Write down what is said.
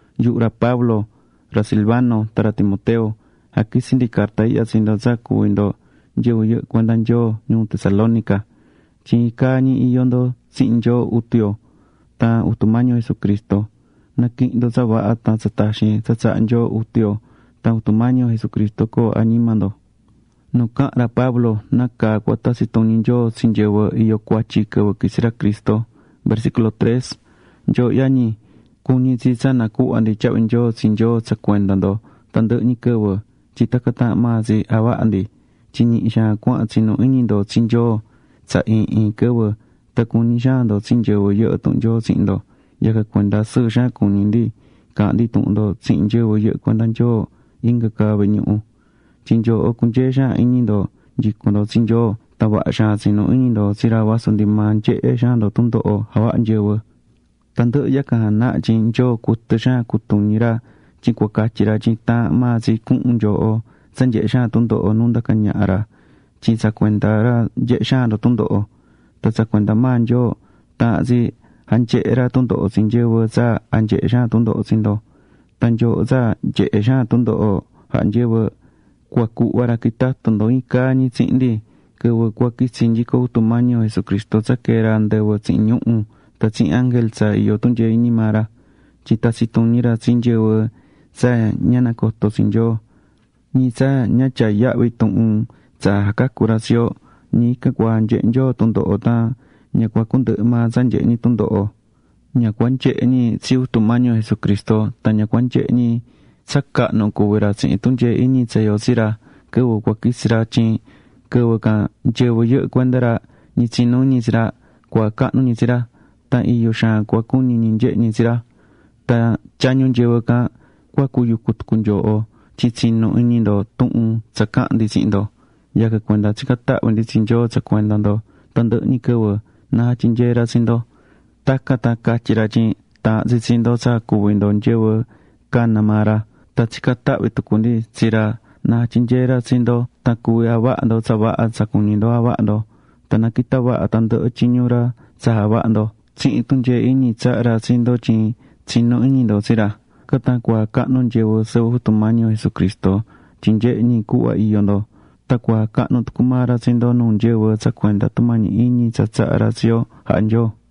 Yuhu ra Pablo, ra Silvano tan ra Timoteo jaquitsí ndi carta ihya tsi ndo tsa cuví ndo nyɨvɨ yɨhɨ́ cuenda Nyoo ñuu Tesalónica. Tyin iin caa ñi iyó ndo tsihin Nyoo Jutu yo tan Jutu Mañi yo Jesucristo. Na̱quihin ndo tsa vaha tan tsa taxin tsa tsahá Nyoo Jutu yo tan Jutu Mañi yo Jesucristo coo añima ndo.Nu caha̱n ra Pablo nácaa cua tatsi tuñi Nyoo tsi nyɨvɨ iyó cuatyi quɨvɨ quitsi ra Cristo Nyooho yañi, cuñí tsi tsa nacuhva ndi tyahvi nyoo tsi Nyoo tsa cuenda ndo tandɨhɨ ñi quɨvɨ, tyin tacan taahán maa tsi javahá ndi tyin ñihi xaan cuahán tsinú iñi ndo tsi Nyoo tsa iin iin quɨvɨ, tan cuñí xaan ndo tsi nyɨvɨ yɨhɨ́ tuhun Nyoo tsihin ndo. Yacan cuenda sɨɨ xaan cuñí ndi caahán ndi tuhun ndo tsihin nyɨvɨ yɨhɨ́ cuenda Nyoo inga ca vehe ñuhu. Tyin nyooho cunyee xaan iñi ndo nyicún ndo tsi Nyoo tan vaha xaan tsinú iñi ndo tsi ra vasu ndi maa nyehé xaan ndo tundoho jahá nyɨvɨ. Tandɨhɨ yacan janahá tyin Nyoo cuɨtɨ xaan jacutuñí ra tyin cua catyi ra tyin taahán maa tsi cuhun nyooho tsa nyehé xaan tundoho nu ndacá ñaha ra tyin tsa cuenda ra nyehé xaan ndo tundoho. Tan tsa cuenda maa Nyoo, taahán tsi janyehe ra tundoho tsi nyɨvɨ tsa janyehé xaan tundoho tsi ndo. Tan nyooho tsa nyehé xaan tundoho jahá nyɨvɨ, cua cuhva ra quitatu ndo iin caa ñi tsihin ndi quɨvɨ cua quitsi nyico Jutu Mañi yo Jesucristo tsa quee ra andɨvɨ tsihin ñuhu̱ tan tsihin ángel tsa iyó tunyee iñi maa ra. Tyin tatsi tuñi ra tsi nyɨvɨ tsa ña nacotó tsi Nyoo, ñi tsa ña tyaá yahvi tuhun tsa jacacú ra tsi yo. Ñi ican cua janyehe Nyoo tundoho tan ña cua cundɨhɨ maa tsa nyehe ñi tundoho, ña cua nyehe ñi tsi Jutu Mañi yo Jesucristo tan ña cua nyehe ñi tsa cahnu cuví ra tsihin tunyee iñi tsa iyó tsi ra quɨvɨ cua quitsi ra. Tyin quɨvɨ can nyɨvɨ yɨhɨ́ cuenda ra, ñi tsinú iñi tsi ra, cua jacahnu ñi tsi ra. Tan iyo xaan cua cuñi ñi nyehe ñi tsi ra. Tan tyañu nyɨvɨ can, cua cuyucu tucu nyooho tyin tsinu̱ iñi ndo tuhun tsa caha̱n ndi tsihin ndo. Yacan cuenda tsicán tahvi ndi tsi Nyoo tsa cuenda ndo tandɨhɨ ñi quɨvɨ, na jatyinyee ra tsi ndo. Tacan tan catyi ra tyin taahán tsi tsi ndo tsa cuví ndo nyɨvɨ cana̱ maa ra. Tan tsicán tahvi tucu ndi tsi ra na jatyinyee ra tsi ndo tan cuvi javaha ndo tsa vaha tsa cuñí ndo javaha ndo. Tan na quita vaha tandɨhɨ tyiñu ra tsa javahá ndo tsihin tunyee iñi tsahá ra tsi ndo tyin tsinú iñi ndo tsi ra. Tacan tan cua jacahnu nyɨvɨ sɨvɨ Jutu Mañi yo Jesucristo, tyin nyehé ñi cuhva iyó ndo. Tan cua jacahnu tucu maa ra tsi ndo nuu nyɨvɨ tsa cuenda tumañi iñi tsa tsahá ra tsi yo jahá Nyoo.